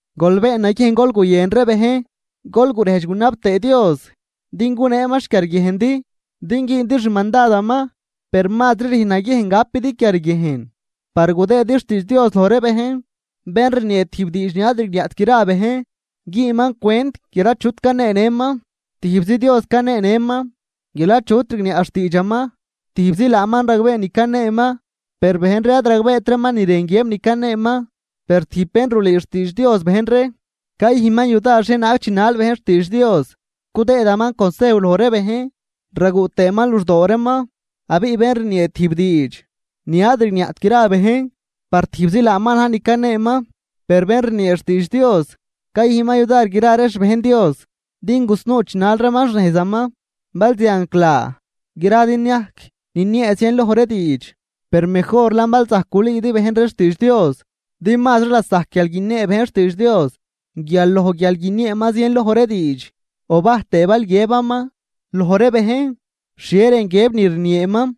Gol been naguiejn gol guyën ree bejn, gol gurejdx gunab tëë Dios din guneeman xquiarguiejndi din güündi xmandadaman, per mazri rüjn naguiejn gapidi quiarguiejn par gudëëdi xtiidx Dios loj ree bejn. Bén rniee tijb diidx ni ad rigniaꞌt gra bejn, güünman cwent guial achut caneenëman. Tijbzi Dios caneenëman guial achut rigniaꞌ xtiidxaman, tijbzi laaman ragbee ni caneeman per bejn ree ad ragbeet reeman ni rën guiëb ni caneeman. Per tijb bén rulüü xtiidx Dios bejn ree cayüjnman yudar xhienaag chinal bejn xtiidx Dios, cudëëdaman consejw loj ree bejn raguꞌ tëëman luxdoo reeman. Abiꞌ bén rniee tijb diidx ni ad rigniaꞌt gra ree bejn, par tijbzi laaman na̱j ni caneeman, per bén rniee xtiidx Dios cayüjnman yudar gra ree xbejn Dios din gusnuu chinal reeman xnejzaman. Bal zianclaa gradi niajc niniee zienloj ree diidx, per mejorlan bal zajc gulüüdi bejn ree xtiidx Dios. Din mazri lasajc guial guiniee bejn xtiidx Dios guial loj guial guinieeman zienloj ree diidx, o bajtëë bal zileꞌ guiëbaman loj ree bejn xhie rën guiëb ni rnieeman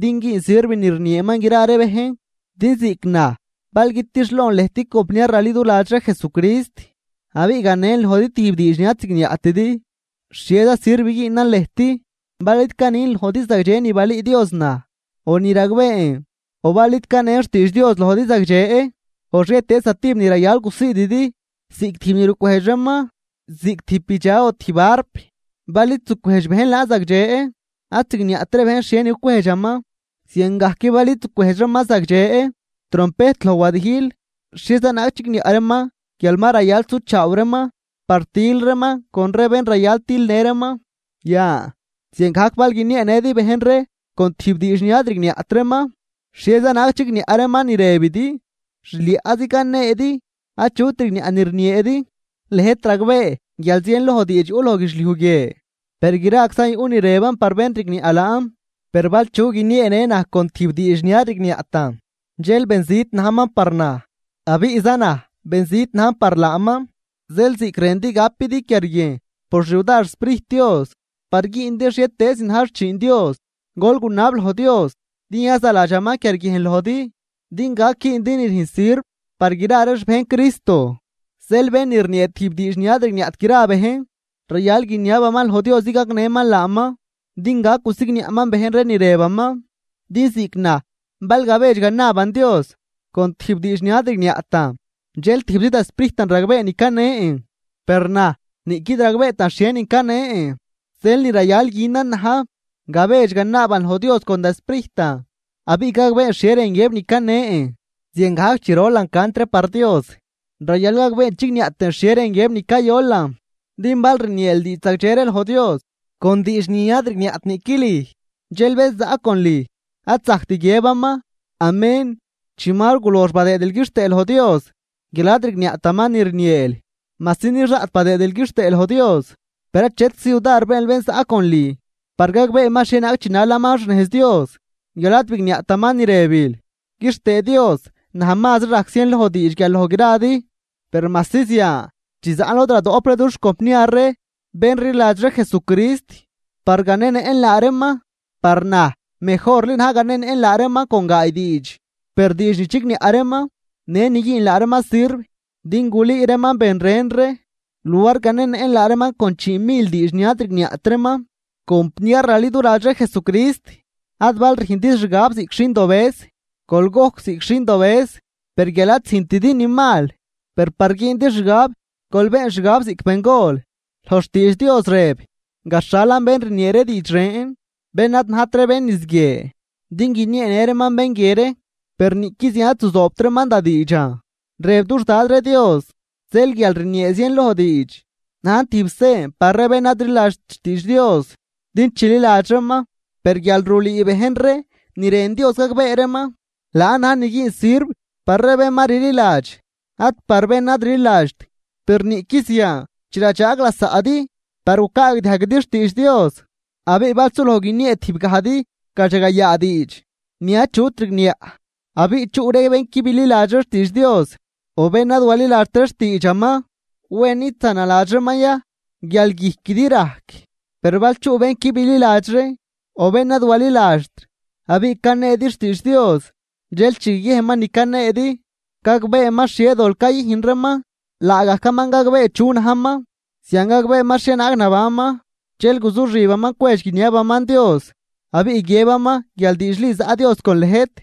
din güün sirv ni rnieeman gra ree bejn. Din ziꞌc naj bal guitixlon lëjt compniar raliduladx ree Jesucrist, abiꞌ ganen lojdi tijb diidx ni ad zigniaꞌtidi, ¿xhieza sirv güünan lëjt bal id canin lojdi zagdxe ni balüü Dios naj o ni ragbeen o bal id canen xtiidx Dios lojdi zagdxe o xhietëëz zatijb ni rayal gusiididi? Ziꞌc tijb ni rucwejdx reeman, ziꞌc tijb bidxa o tijb arp bal id zucwejdx bejn laan zagdxe ad zigniaꞌt ree bejn xhienin cucwejdxaman. Ziangajc bal id zucwejdx reeman zagdxe trompejt loj wadijl, ¿xhieza naag chigniaꞌ reeman guial ma rayal suchaaw reeman par til reeman con ree bén rayal tilnë reeman? Yan ziangajc bal guinieenëdi bejn ree con tijb diidx ni ad rigniaꞌt reeman, ¡xhieza naag chigniaꞌ reeman ni rëbidi! Xliaꞌzi caneedi achut rigniaꞌ ni rnieedi. Lëjt ragbee guial zienloj diidx yuꞌ loj guidxliuj guie, per graczan yuꞌ ni rëban par bén rigniaꞌ laan. Per bal chu guinieenë naj con tijb diidx ni ad rigniaꞌtan dxel benzit najman par naj abiꞌ za naj benzit najn par laaman. Zeel ziꞌc rëndi gapidi quiarguiejn por xyudar xSprijt Dios par güündi xhietëëz ni na̱j xchiin Dios, gol gunab loj Dios din yazaladxaman quiarguiejn lojdi din gac güündi ni rüjn sirv par gra ree xbejn Cristo. Zeel bén ni rniee tijb diidx ni ad rigniaꞌt gra ree bejn, rayal guiniabaman loj Dios din gagnëman laaman din gac gusigniaꞌman bejn ree ni rëbaman. Din ziꞌc naj bal gabedx ganaaban Dios con tijb diidx ni ad rigniaꞌtan dxel tijbzi da sprijtan ragbee ni canen, per naj niꞌquid ragbeetan xhienin canen. Zeel ni rayal günan na̱j, gabedx ganaaban loj Dios con da sprijtan abiꞌ gagbeen xhie rën guiëb ni canen. Ziangajc chi rolan cant ree par Dios rayal gagbeen chigniaꞌ tëën xhie rën guiëb ni cayolan. Din bal rnieel diidx zagdxe ree loj Dios con diidx ni ad rigniaꞌt niꞌqui lüj. Dxel bén zaꞌ con lüj, ad zajct guiëbaman “Amén” chi ma gulox badëëdil quixtëë loj Dios guial ad rigniaꞌtaman ni rnieel. Majsi nix daꞌt badëëdil quixtëë loj Dios, per achetczi yudar beenl bén zaꞌ con lüj par gagbeeman xhienaag chinalaman xnejz Dios guial ad bigniaꞌtaman ni rëbil. Quixtëë Dios naj mazri rajc zien loj diidx guial loj gradi. Per majsi zian chi zaꞌn lod radoꞌp ree dux compniar ree bén rliladx ree Jesucrist par ganenëꞌn laa reeman, par na̱j mejorli na̱j ganenëꞌn laa reeman con gaay diidx per diidx ni chigniaꞌ reeman në ni güün laa reeman sirv din gulüü reeman ben ren ree luar ganenëꞌn laa reeman con chiimil diidx ni ad rigniaꞌt reeman. Compniar raliduladx ree Jesucrist, ad bal rüjnridi xgab ziꞌc xindobëz. Gol gojc ziꞌc xindobëz per guial ad züjntidi ni mal, per par güündi xgab gol been xgab ziꞌc bengol. Loj xtiidx Dios rëb: “Gaxhalan bén rniee ree diidx ren, bén ad najt ree bén niz guie din guinieenë reeman bén guie ree. Per niꞌqui zian ad zuzoobt reeman da diidxan, rëb dux Dad ree Dios.” Zeel guial rniee zienloj diidx, najn tijb sen par ree bén ad rliladxt xtiidx Dios din chililadx reeman. Per guial rulüü bejn ree ni rën Dios gagbee reeman, laan na̱j ni güün sirv par ree bén ma rliladx ad par bén ad rliladxt. Per niꞌqui zian chi radxaag lasaꞌdi par gucaagdiajguidi xtiidx Dios, abiꞌ bal suloj guiniee tijb gajdi gadxagayaa diidx ni achut rigniaꞌ abiꞌ chuꞌ ree bén qui bililadxri xtiidx Dios o bén ad waliladxt ree xtiidxaman, ¿wen id zanaladx reeman ya guial guijquidi rajc? Per bal chuꞌ bén qui bililadxri o bén ad waliladxt abiꞌ caneedi xtiidx Dios, dxel chi guiguiejnman ni caneedi, gagbeeman xhie dol cayüjn reeman, laagajcaman gagbee chu najman. Zian gagbeeman xhienaag nabanman dxel guzuxibaman cwedx guiniabaman Dios, abiꞌ guiëbaman guial diidxli zaꞌ Dios con lëjt.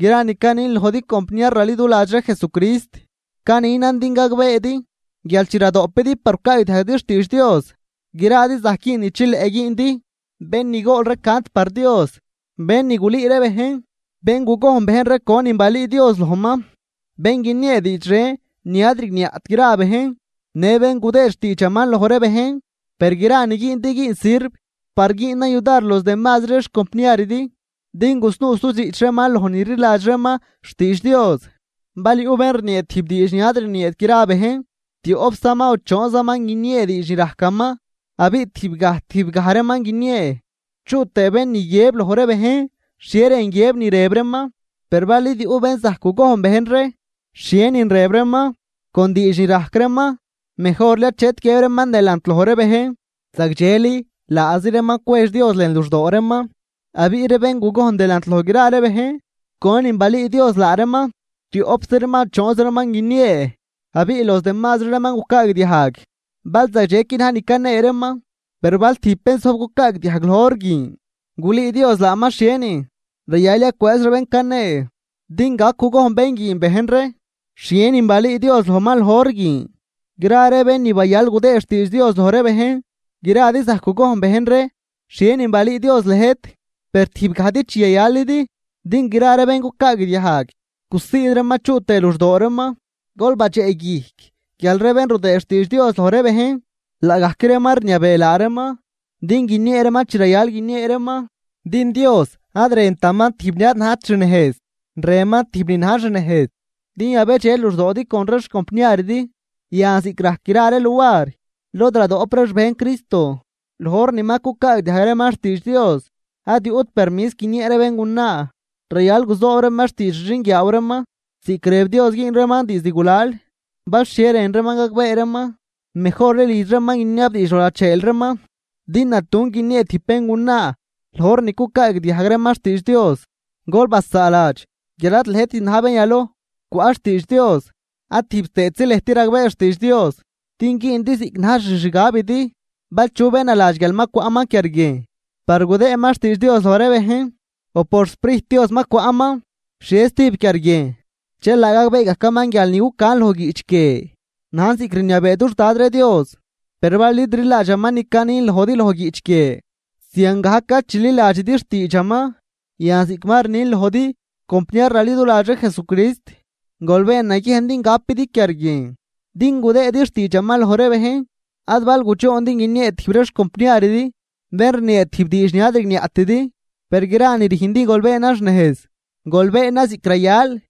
Gra ni canin lojdi compniar raliduladx ree Jesucrist, caninan din gagbeedi guial chi radoꞌpidi par gucaagdiajguidi xtiidx Dios, gradi zajc güün ni chileꞌ güündi, bén ni gool cant par Dios, bén ni gulüü ree bejn, bén gugojn bejn ree conin balüü Dios lojman, bén guiniee diidx ren ni ad rigniaꞌt gra bejn në bén gudëëd xtiidxaman loj ree bejn. Per gra ni güündi güün sirv par güünan yudar los demazri ree xcompniaridi din gusnuu sudxiꞌch reeman loj ni rliladx reeman xtiidx Dios. Bal yuꞌ bén rniee tijb diidx ni ad rnieet gra bejn, tioꞌpzaman o choonzaman guiniee diidx ni rajcaman, abiꞌ tijb gaj tijb gaj reeman guiniee, chuꞌ tëë bén ni guiëb loj ree bejn xhie rën guiëb ni rëb reeman. Per bal id yuꞌ bén zajc gugojn bejn ree xhienin rëb reeman con diidx ni rajc reeman, mejorli achet guiëb reeman delant loj ree bejn. Zagdxeli laazi reeman cwedx Dios lën luxdoo reeman. Abiꞌ ree bén gugojn delant loj gra ree bejn conin balüü Dios laa reeman, tioꞌpzi reeman o choon reeman guiniee. Abiꞌ los demazri reeman gucaagdiajg bal zagdxequi na̱j ni canee reeman. Per bal tijb bén zojb cucaagdiajg loj hor guin gulüü Dios laaman xhienin, rayal yacwëëz bén canee din gac gugojn bén guin bejn ree xhie nin balüü Dios lojman loj hor guin. Gra ree bén ni bayal gudëëd xtiidx Dios loj ree bejn, gradi zajc gugojn bejn ree xhienin balüü Dios lëjt, per tijb gajdi chi yayalidi din gra ree bén cucaagdiajg gusiid reeman chuꞌ tëë luxdoo reeman. Gol badxeꞌguijc guial ree bén rudëë xtiidx Dios loj ree bejn laagajc reeman rniabee laa reeman din guiniee reeman chi rayal guiniee reeman. Din Dios ad rëntaman tijb ni ad najt xnejz, rënman tijb ni na̱j xnejz din yabedxe luxdoodi con ree xcompniaridi. Yan, ziꞌc rajc gra ree luar lod radoꞌp ree xbejn Cristo, loj hor ni ma cucaagdiajg reeman xtiidx Dios ad yuꞌt permis guiniee ree béngunaa rayal guzoob reeman xtiidx xixinguiaaw reeman ziꞌc rëb Dios güün reeman diizd gulal. Bal xhie rën reeman gagbee reeman, mejorli lidx reeman guiniabdiidx loj lacheel reeman, din natun guiniee tijb béngunaa loj hor ni cucaagdiajg reeman xtiidx Dios. Gol basaaladx guial ad lëjtit na̱j bén yaloj cwaꞌ xtiidx Dios ad tijb tëëtzi lëjt ragbee xtiidx Dios din güündi ziꞌc na̱j xixgabidi. Bal chu bén naladx guial ma cwaꞌman quiarguiejn par gudëëman xtiidx Dios loj ree bejn o por xSprijt Dios ma cwaꞌman xhie stijb quiarguiejn, dxel laa gagbee gajcaman guial ni cucan loj guiꞌch guie najn ziꞌc rniabee dux Dad ree Dios. Per bal id rliladxaman ni canin lojdi loj guiꞌch guie, ziangajc ad chililadxidi xtiidxaman. Yan ziꞌc ma rnin lojdi compniar raliduladx ree Jesucrist, gol been naguiejn din gapidi quiarguiejn din gudëëdi xtiidxaman loj ree bejn, ad bal gudxoondi guiniee tijb ree xcompniaridi bén rniee tijb diidx ni ad rigniaꞌtidi. Per gra ni rüjndi gol beenan xnejz, gol beenan ziꞌc rayal.